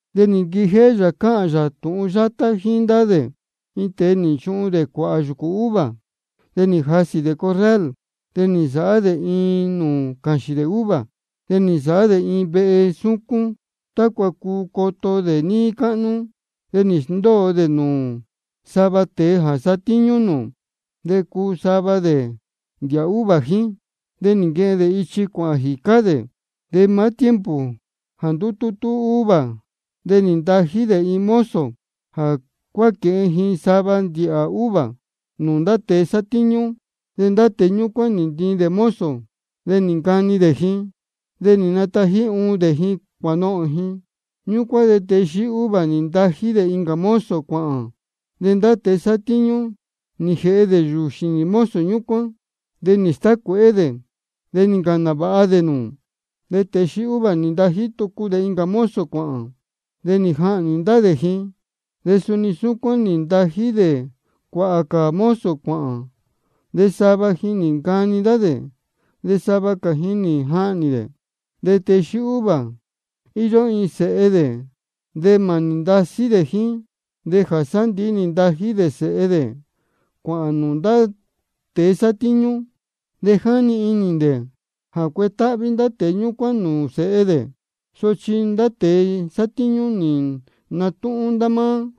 De nī nquijéhé yā cáhān yā tūhun yátá jíín ndá dē: Iin tēe nī nchuhun dē cuāhā yūcū uva. De nī jasī dē corral, de nī nsāhá dē iin nūū cāxīn dē uva. De nī nsāhá dē iin vehe súcún tácua cuu coto dē níí cáhnú. De nī sndóo dē nūū sava tēe jā satíñú nūū, de cuu sava dē ndīhā jíín. De nī nquehen dē ichi cuāhān jīcá dē. De maá tiempo jā ndutútú uva, de nī ntají dē iin mozo jā cuánaquēhen ji sava ndīhā uva nūū ndá tēe sátíñú. De ndá tēe ñúcuán nī ntiin dē mozo, de nī ncani dē ji, de nī natají uun dē ji cuānohōn ji. Ñúcuán de tēe xíí uva nī ntají dē incā mozo cuāhān. De ndá tēe sátíñú nī jēhe dē yūū xīnī mozo ñúcuán, de nī stácuēhé dē, de nī ncāhān nāvāha dē nūū. De tēe xíí uva nī ntají tucu dē incā mozo cuāhān. De nī jahnī ndá dē ji. De suni súcuán nī ntají dē cuāhā cā mozo cuāhān, de sava ji nī ncani ndá dē, de sava cā ji nī jahnī dē. De tēe xíí uva, íyó iin sēhe dē de mānī ndasí dē jíín. De jā sándīhí de nī ntají dē sēhe dē cuāhān nūū ndá tēe sátíñú. De jáni inī dē jā cuetáhví ndá tēe ñúcuán nūū sēhe dē. Sochi ndá tēe sátíñú nī natúhún ndá máá: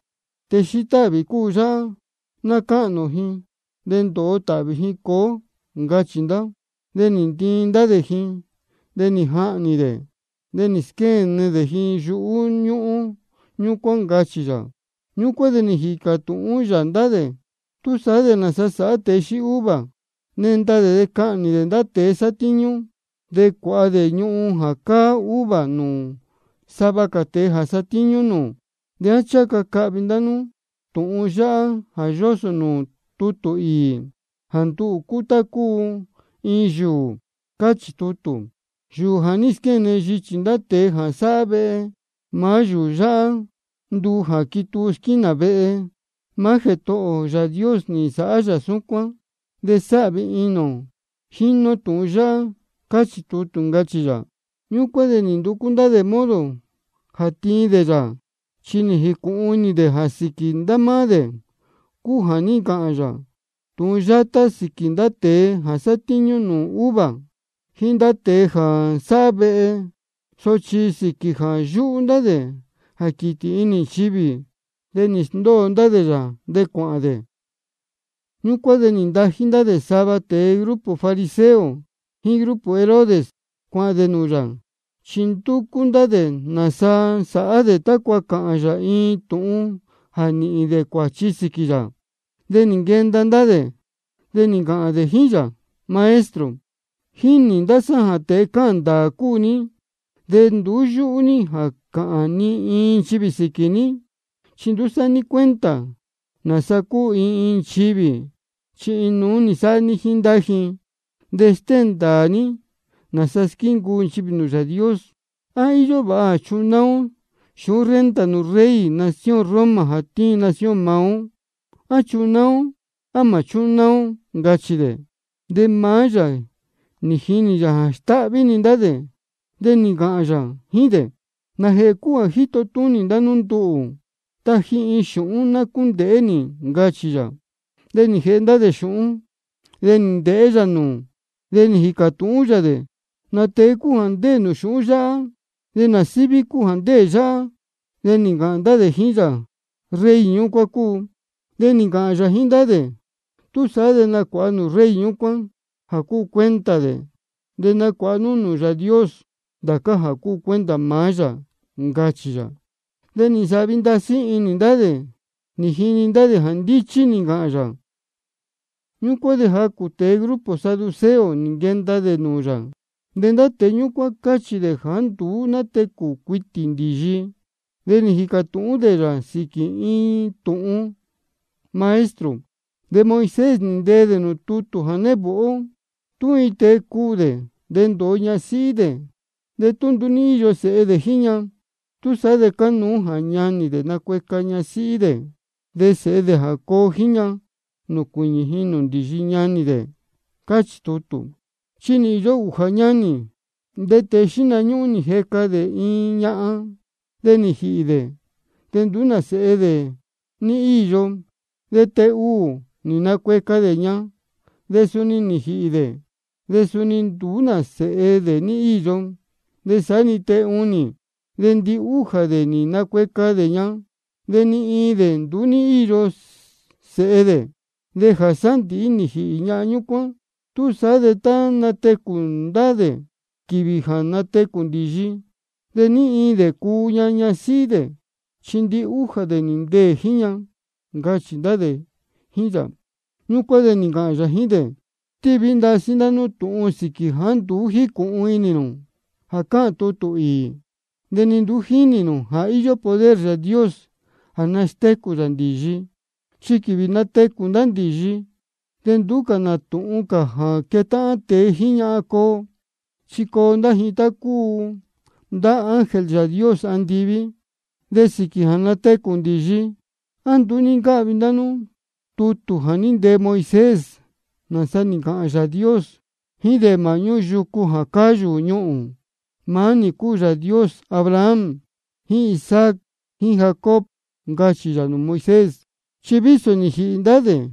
Tēe xíí táhvī cúu yáhá. Ná cáhnī ō ji, de ndōo tāhvī ji cuu ó, ncachī ndá. De nī ntiin ndá dē ji, de nī jahnī dē, de nī squéne dē ji yuhú ñúhún ñúcuán, ncachī yā. Ñúcuán de nī jīcā tūhún yā ndá dē: ¿Túsaá de nāsa sāhá tēe xíí uva? Nenda dē de cahnī dē ndá tēe sátíñú, de cuāha dē ñuhun jā cáá uva nūū sava cā tēe jā satíñú nūū. ¿De á ncháha ca cahvi ndá nú tūhun yáhá jā yósō nūū tutū īī, jā nduhū cúu tá cúu iin yūū? Chi cáchī tutū: Yūū jā ní squéne yichī ndá tēe jā sáhá vehe, maá yūū yáhá nduu jā quituu squínā vehe. Maá Jētohō ō Yāā Dios nī nsāhá yā súcuán, de sáhvi inī ō jínī ō tiñu yáhá. Cáchī tutū, ncachī yā. Ñúcuán de nī nducú ndá dē modo jā tiin dē yā. Chi nī jīcūhun inī dē jā sīquī ndá máá dē cúu jā ní ncāhān yā tūhun yátá sīquī ndá tēe jā sátíñú nūū uva jíín ndá tēe jā sáhá vehe. Sochi sīquī jā yúhú ndá dē jā quītī inī nchivī, de nī sndóo dē yā, de cuāhān dē. Ñúcuán de nī ntají ndá dē sava tēe grupo fariseo jíín grupo Herodes, cuāhān dē nūū yā, chi ndúcú ndá dē nāsa sāhá dē tácua cāhān yā iin tūhun jā nīhīn dē cuāchi sīquī yā. De nī nquenda ndá dē, de nī ncāhān dē jíín yā: Maestro, jínī ndá sá jā tēe cáhān ndāā cúu ní, de nduú yúhú ní jā cāhān ni iin nchivī sīquī ní. Chi nduú sáhá ní cuenta nāsa cúu iin iin nchivī, chi inuú-ni sáhá ní jíín ndá ji. De stéhēn ndāā ní nāsa squíncuu nchivī nūū Yāā Dios. ¿De á íyó vāha jā chunáá ó xūhún renta nūū rey nación Roma jā tíin nación maá ó? ¿A chunáá ó, á mā chúnáá ó? ncachī dē. De maá yā jínī yā jā stáhví-ni ndá dē, de nī ncāhān yā jíín dē: ¿Nājēhē cúu jā jíto túnī ndá nú nduhū? Taji iin xūhún ná cúndēhé nī, ncachī yā. De nī jēhe ndá dē xūhún, de nī ndēhé yā nūū, de nī jīcā tūhún yā dē: ¿Nā tēe cúu jā ndéē nūū xūhún yáhá, de nā síví cúu jā ndéē yáhá? De nī ncāhān ndá dē jíín yā: Rey ñúcuán cúu. De nī ncāhān yā jíín ndá dē: Túsaá de nacuāha nú nūū rey ñúcuán jā cúu cuenta dē, de nacuāha nú nūū Yāā Dios ndācá jā cúu cuenta maá yā, ncachī yā. De nī nsāhvi ndasí inī ndá dē nī jini dē jā ndíchí nī ncāhān yā. Ñúcuán de jacū tēe grupo saduceo nī nquenda dē nūū yā. De ndá tēe ñúcuán cáchī dē jāá nduú nátecū cuitī ndīyi. De nī jīcā tūhún dē yā sīquī iin tūhun: Maestro, de Moisés nī ntee dē nūū tutū jā névāhá ó: Tú iin tēe cuū dē, de ndōo ñasíhí dē, de tú nduú ní íyo sēhe dē jíín ña, túsaá de cánuú jā ñanī dē nacueca ñasíhí dē, de sēhe dē jā coo jíín ña, nūcuīñī ji nūū ndīyi ñanī dē, cáchī tutū. De nī īyo ūjā ñanī. De tēe xíhna ñúhún nī jeca dē iin ñahan. De nī jīhī dē, de nduú nā sēhe dē ní íyo. De tēe ūū nī nacueca dē ña, de suni nī jīhī dē, de suni nduú nā sēhe dē ní íyo. De saá-ni tēe ūnī. De ndihújā dē nī nacueca dē ña, de ni iin dē nduú ní íyo sēhe dē. De jā sándīhí de nī jīhī ñahan ñúcuán. Túsaá de tá natecū ndá dē quīvī jā natecū ndīyi, ¿de ní iin dē cuu ña ñasíhí dē? Chi ndihújā dē nī ndeē jíín ña, ncachī ndá dē jíín yā. Ñúcuán de nī ncāhān yā jíín dē: Ndasí stíví ndá nú tūhun sīquī jāá nduú jícūhun inī nū jā cáhān tutū īī, de ni nduú jínī nū jā íyó poder Yāā Dios jā nastécū yā ndīyi. Chi quīvī jā natecū ndá ndīyi, de nduú cā nā tūhun jā quetáhán tēe jíín ñahan coo. Chi coo ndá ji tá cúu ndá ángel Yāā Dios andiví. De sīquī jā natecū ndīyi, ¿á nduú ní ncáhvi ndá nú tutū jā ní ntee Moisés, nāsa nī ncāhān Yāā Dios jíín dē māhñú yūcū jā cáyū ñuhūn? Maá nī cúu Yāā Dios Abraham jíín Isaac jíín Jacob, ncachī yā nūū Moisés. Chi vísō ja nī jīhī ndá dē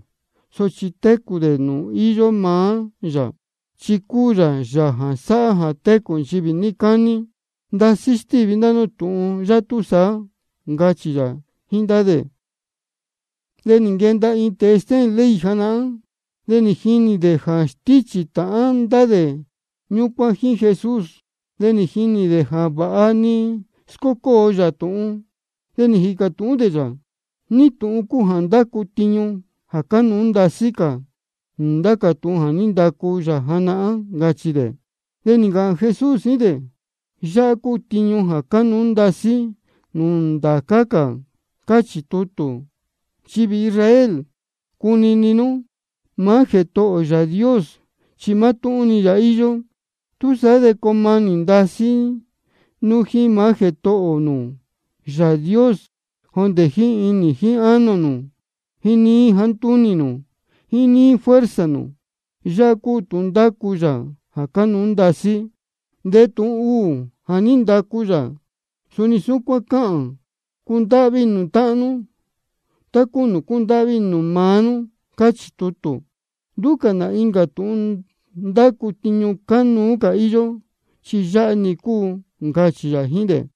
sochi técū dē nūū íyó maá yā, chi cúu yā Yāā jā sáhá jā técū nchivī níí cání. Ndasí stíví ndá nú tūhun yā túsaá, ncachī yā jíín ndá dē. De nī nquenda iin tēe stéhēn ley janahán, de nī jini dē jā stíchī tāhán ndá tēe ñúcuán jíín Jesús. De nī jinī dē jā vāha nī scócóo yā tūhun. De nī jīcā tūhún dē yā: ¿Ní tūhun cúu jā ndácu tiñu jā cánuú ndasí cā nūū ndá cā tūhun jā ní ndacu yā janahán? ncachī dē. De nī ncāhān Jesús jíín dē: Yáhá cúu tiñu jā cánuú ndasí cā nūū ndācá cā: Cáchī tutū: Nchivī Israel, cunini nú: Maá Jētohō ō Yāā Dios chi mátúhún yā-ni íyó. Túsaá de coo manī ndasí nú jíín maá Jētohō nū Yāā Dios jondē jíín inī jíín ánō nū, jíín níí jāá ntúnī nū, jíín níí fuerza nū. Yāhá cúu tūhun ndácu yā jā cánuú ndasí cā. De tūhun ūū jā ní ndacu yā, suni súcuán cáhān: Cundáhví inī nū táhán nú tá cúu nūū cúndáhví inī nū maá nú, cáchī tutū. Nduú cā nā incā tūhun ndácu tiñu cánuú cā íyó, chi yáhá-ni cúu, ncachī yā jíín dē.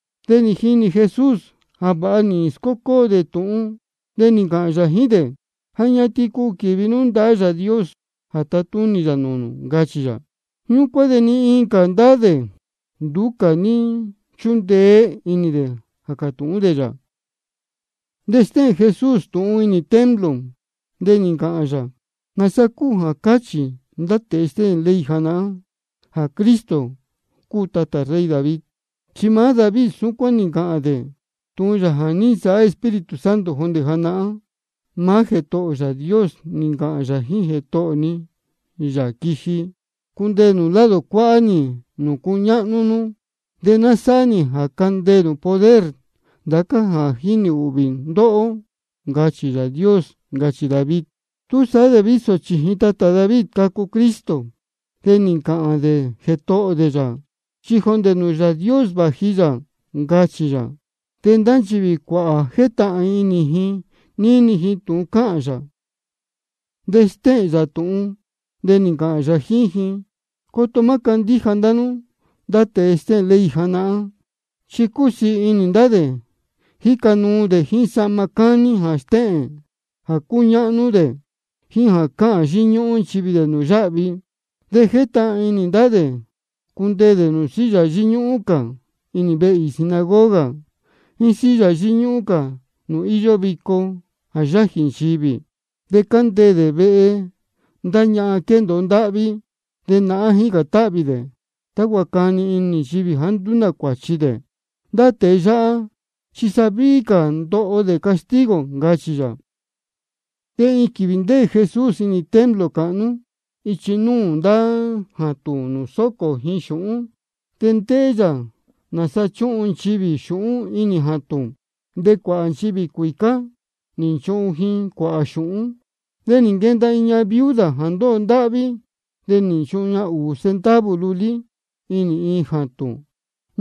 De nī jinī Jesús jā vāha nī scócóo dē tūhun, de nī ncāhān yā jíín dē: Ja ñatin cuu quīvi nú ndahá Yāā Dios jā tatúnī yā nūū nū, ncachī yā. Ñúcuán de ni iin cā ndá dē, nduú cā ní nchúndeé inī dē jā cātūhún dē yā. De stéhēn Jesús tūhun inī templo, de nī ncāhān yā: ¿Nāsa cúu jā cáchī ndá tēe stéhēn ley janahán jā Cristo cúu tatā rey David? Chi maá David súcuán nī ncāhān dē tūhun yā nī nsāhá Espíritu Santo jondē janahán: Maá Jētohō ō Yāā Dios nī ncāhān yā jíín Jētohō ni, Yāā jā quiji: Cundeē nū lado cuáhá nī nūū cuñáhnú nú, de ná sáhá nī jā candeē nū poder ndācá jā jínī ūhvī ndóhó. Ncachī Yāā Dios. Ncachī David. Túsaá de vísō chījin tatā David cacu Cristo, de nī ncāhān dē Jētohō dē yā, chi jondē nūū Yāā Dios vāji yā, ncachī yā. De ndá nchivī cuāhā jétahān inī ji níni ji tūhun cáhān yā. De stéhēn yā tūhun, de nī ncāhān yā jíín ji: Coto má candíja ndá nú ndá tēe stéhēn ley janahán. Chi cúsiī inī ndá dē jíca nuu dē jíín sahma cání jā stéhēn jā cúñáhnú dē, jíín jā cáhān yíñúhún nchivī dē nūū yáhvi. De jétahān inī ndá dē cundeē dē nūū silla yíñúhún cā inī vehe īī sinagoga, jíín silla yíñúhún cā nūū íyó vico jā yájī nchivī. De cándeē dē vehe ndá ñahan quéndōo ndáhví. De nahán jícān táhvī dē tácua cani inī nchivī jāá nduú nā cuāchi dē. Ndá tēe yáhá chi sa víhí cā ndoho dē castigo, ncachī yā. De iin quīvī ndéē Jesús inī templo cāhnú ichi núū ndá jātūn nūū sócō ji xūhún. De ndéhé yā nāsa chúhun nchivī xūhún inī jātūn. De cuāhā nchivī cuīcá nī nchuhun ji cuāhā xūhún. De nī nquenda iin ñahan viuda jā ndóho ndáhví. De nī nchuhun ña ūū centavo lulí inī iin jātūn.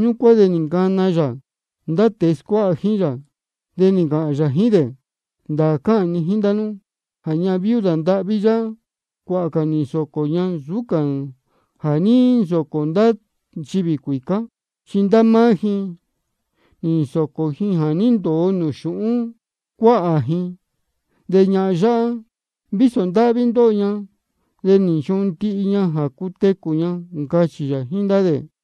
Ñúcuán de nī ncana yā ndá tēe scuáha jíín yā, de nī ncāhān yā jíín dē: Ndāā cáhān ni jíín ndá nú jā ñahan viuda ndāhví yáhá, cuāhā cā nī nsōcō ña nsūú cā jā ní nsōcō ndá nchivī cuīcá. Chi ndá máá ji nī nsōcō ji jā ní ndōo nūū xūhún cuáhā ji. De ñahan yáhá, vísō ndáhví ndóho ña, de nī nchuhun ña ndihi jā cutecū ña, ncachī yā jíín ndá dē.